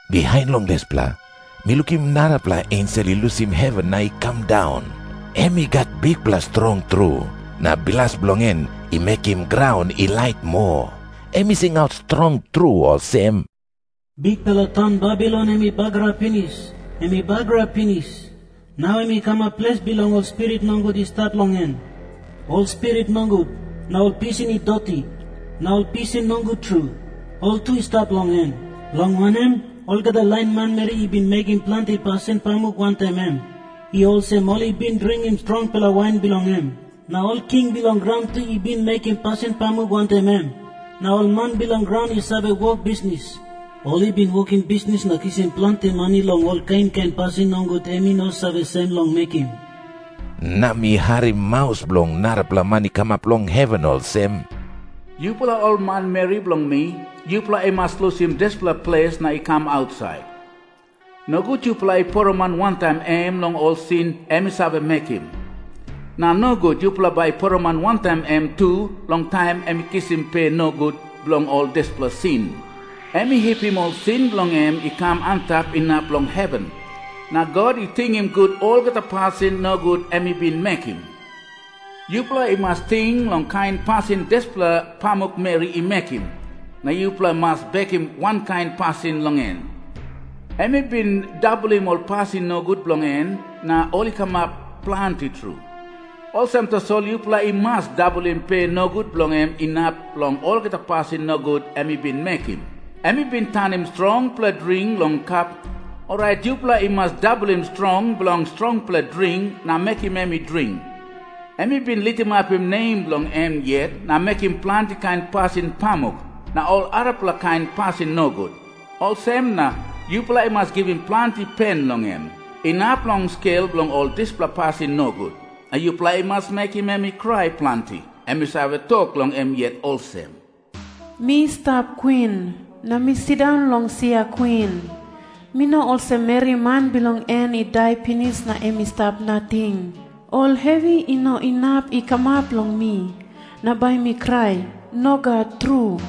Bihain long dispela, mi lukim narapela ensel i lusim heven na i kam daun. Em i gat bikpela strong tru, na bilas bilong en i mekim graun i lait moa. Em i singaut strong tru olsem, “Bikpela taun Babilon em i bagarap pinis! Em i bagarap pinis! Nau em i kamap ples bilong ol spirit nogut i stap long en. Ol spirit nogut, na ol pisin i doti, na ol pisin nogut tru, ol tu i stap long en. Long wanem, olgeta lain manmeri i bin mekim planti pasin pamuk wantaim em. I olsem ol i bin dringim strongpela wain bilong em. Na ol king bilong graun tu i bin mekim pasin pamuk wantaim em. Na ol man bilong graun i save wok bisnis, ol i bin wokim bisnis na kisim planti mani long ol kain kain pasin nogut em i no save sem long mekim.” Na mi harim maus bilong narapela man i kamap long heven olsem, “Yupela ol manmeri bilong mi, yupela i mas lusim dispela ples na i kam ausait. Nogut yupela i poroman wantaim em long ol sin em i save mekim. Na nogut yupela bai i poroman wantaim em tu long taim em i kisim pe nogut bilong ol dispela sin. Em i hipim ol sin bilong en i kam antap inap long heven. Na God i tingim gut olgeta pasin nogut em i bin mekim. Yupela i mas ting long kain pasin dispela pamukmeri i mekim, na yupela i mas bekim wankain pasin long em. Em i bin dabolim ol pasin nogut bilong en na ol i kamap planti tru. Olsem tasol yupela i mas dabolim pe nogut bilong em inap long olgeta pasin nogut em i bin mekim. Em i bin tanim strongpela dring long kap. Orait yupela i mas dabolim strong bilong strongpela dring na mekim em i dring. Em i bin litimapim nem bilong em yet na mekim planti kain pasin pamuk na ol arapela kain pasin nogut. Olsem na yupela i mas givim planti pen long em, inap long skel bilong ol dispela pasin nogut. Na yupela i mas mekim em i krai planti. Em i save tok long em yet olsem, ‘Mi stap kwin, na mi sindaun long sia kwin. Mi no olsem meri man bilong en i dai pinis na em i stap nating. Ol hevi i no inap i kamap long mi, na bai mi krai. Nogat tru.’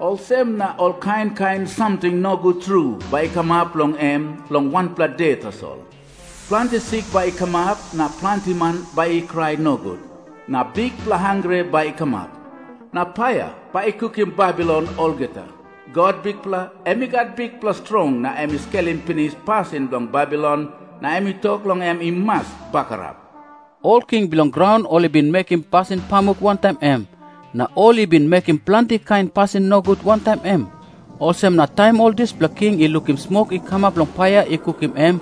Olsem na ol kain kain samting nogut tru bai i kamap long em long wanpela de tasol. Planti sik bai i kamap, na planti man bai i krai nogut, na bikpela hangre bai i kamap. Na paia bai i kukim Babilon olgeta. God, Bikpela em i gat bikpela strong na em i skelim pinis pasin bilong Babilon na em tok long em i mas bagarap. “Ol king bilong graun ol i bin mekim pasin pamuk wantaim em, na ol i bin mekim planti kain pasin nogut wantaim em. Olsem na taim ol dispela king i lukim smok i kamap long paia i kukim em,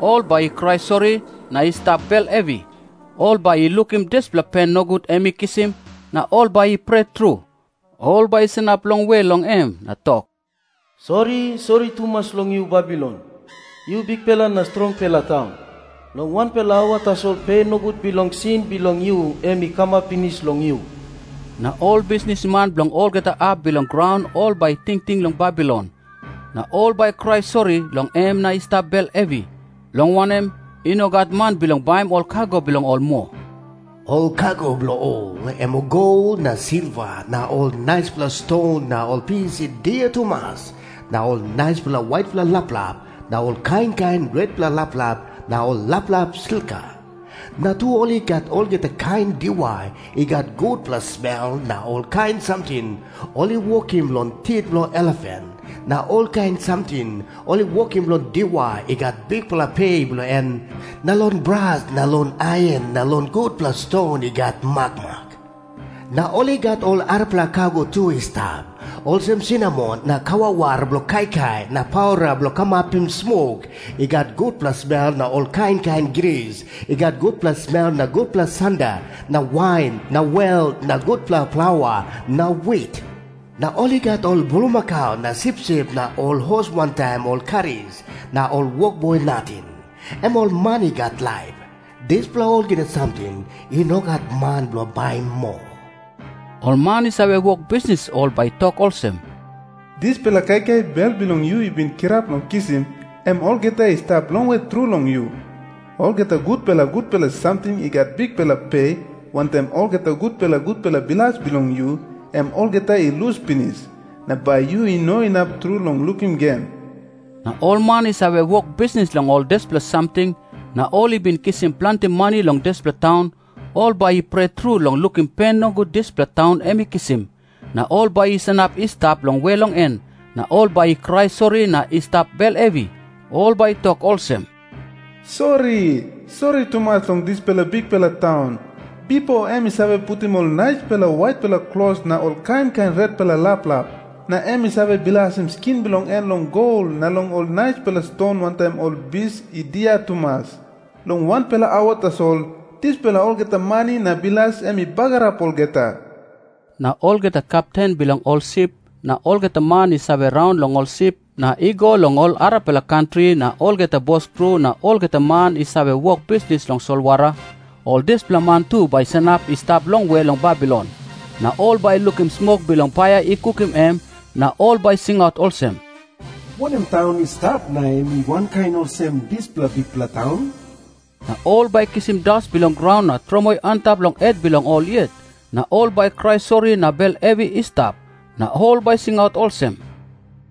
ol bai i krai sori na i stap bel hevi. Ol bai i lukim dispela pen nogut em i kisim, na ol bai i pret tru. Ol bai i sanap longwe long em na tok, ‘Sori, sori tumas long yu Babilon, yu bikpela na strongpela taun! Long wanpela aua tasol pe nogut bilong sin bilong yu em i kamap pinis long yu!’ “Na ol bisnisman bilong olgeta hap bilong graun ol bai i tingting long Babilon, na ol bai i krai sori long em na i stap bel hevi. Long wanem, i no gat man bilong baim ol kago bilong ol moa. Ol kago bilong ol, em gol na silva na ol naispela ston na ol bis i dia tumas na ol naispela waitpela laplap na ol kain kain retpela laplap na ol laplap slika. Na tu ol i gat olgeta kain diwai i gat gutpela smel na olkain samting ol i wokim long tit bilong elefan na olkain samting ol i wokim long diwai i gat bikpela pe bilong en na long bras na long ain na long gutpela ston i gat makmak. Na ol i gat ol arapela kago tu i stap, olsem sinamon na kawawar bilong kaikai na paura bilong kamapim smok i gat gutpela smel na ol kain kain gris i gat gutpela smel na gutpela sanda na wain na wel na gutpela plaua na wit. Na ol i gat ol bulmakau na sipsip na ol hos wantaim ol karis na ol wokboi nating, em ol man i gat laip. Dispela olgeta samting i no gat man bilong baim moa. Ol man i save wok bisnis ol bai i tok olsem, ‘Dispela kaikai bel bilong yu i bin kirap long kisim, em olgeta i stap longwe tru long yu. Olgeta gutpela gutpela samting i gat bikpela pe wantaim olgeta gutpela gutpela bilas bilong yu, em olgeta i lus pinis, na bai yu no inap tru long lukim gen.’ “Na ol man i save wok bisnis long ol dispela samting, na ol i bin kisim planti mani long dispela taun, ol bai i pret tru long lukim pen nogut dispela taun em i kisim. Na ol bai i sanap i stap longwe long en, na ol bai i krai sori na i stap bel hevi. Ol bai i tok olsem, ‘Sori, sori tumas long dispela bikpela taun! Bipo em i save putim ol naispela waitpela klos na ol kain kain retpela laplap, na em i save bilasim skin bilong en long gol na long ol naispela ston wantaim ol bis i dia tumas. Long wanpela aua tasol, dispela olgeta mani na bilas em i bagarap olgeta.’ “Na olgeta kepten bilong ol sip na olgeta man i save raun long ol sip na i go long ol arapela kantri na olgeta boskru na olgeta man i save wok bisnis long solwara, ol dispela man tu bai i sanap i stap longwe long Babilon. Na ol bai i lukim smok bilong paia i kukim em, na ol bai i singaut olsem, ‘Wanem taun i stap na em i wankain olsem dispela bikpela taun?’ Na ol bai i kisim das bilong graun na tromoi antap long het bilong ol yet, na ol bai i krai sori na bel hevi i stap. Na ol bai i singaut olsem,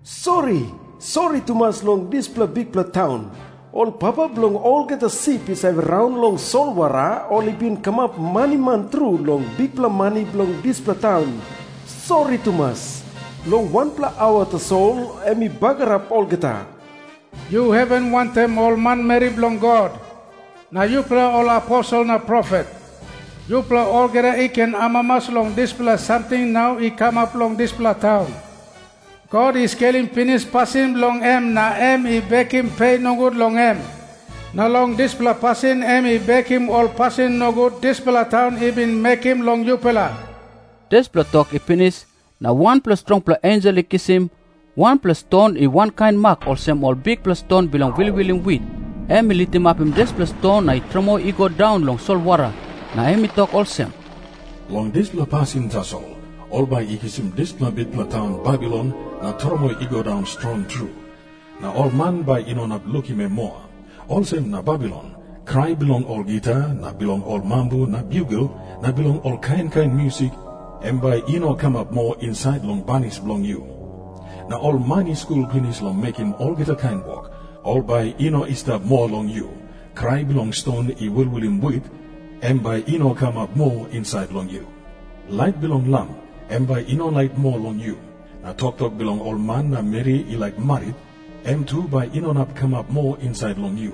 ‘Sori, sori tumas long dispela bikpela taun! Ol papa bilong olgeta sip i save raun long solwara ol i bin kamap maniman tru long bikpela mani bilong dispela taun. Sori tumas! Long wanpela aua tasol em i bagarap olgeta!’ “Yu heven wantaim ol manmeri bilong God, na yupela ol aposel na profet, yupela olgeta i ken amamas long dispela samting nau i kamap long dispela taun. God i skelim pinis pasin bilong em na em i bekim pe nogut long em. Na long dispela pasin em i bekim ol pasin nogut dispela taun i bin mekim long yupela.” Dispela tok i pinis, na wanpela strongpela ensel i kisim wanpela ston i wankain mak olsem ol bikpela ston bilong wilwilim wit. Em i litimapim dispela ston na i tromoi i go daun long solwara. Na em i tok olsem, “Long dispela pasin tasol ol bai i kisim dispela bikpela taun Babilon na tromoi i go daun strong tru, na ol man bai i no inap lukim em moa. Olsem na, Babilon, krai bilong ol gita na bilong ol mambu na biugel na bilong ol kain kain musik, em bai i no kamap moa insait long banis bilong yu. Na ol man i skul pinis long mekim olgeta kain wok, ol bai i no i stap moa long yu. Krai bilong ston i wilwilim wit, em bai i no kamap moa insait long yu. Lait bilong lam, em bai i no lait moa long yu. Na toktok bilong ol man na meri i laik marit, em tu bai i no inap kamap moa insait long yu.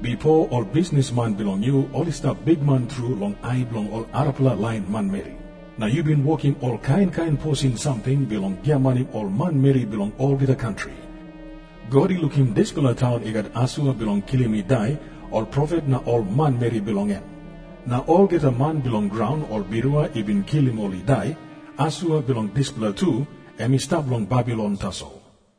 Bipo ol bisnisman bilong yu ol i stap bikman tru long ai bilong ol arapela lain manmeri. Na yu bin wokim ol kain kain posin samting na mekim ol kain kain trik bilong giamanim ol manmeri bilong olgeta kantri.” God i lukim dispela taun i gat asua bilong kilim i dai ol profet na ol manmeri bilong en. Na olgeta man bilong graun ol birua i bin kilim ol i dai, asua bilong dispela tu em i stap long Babilon tasol.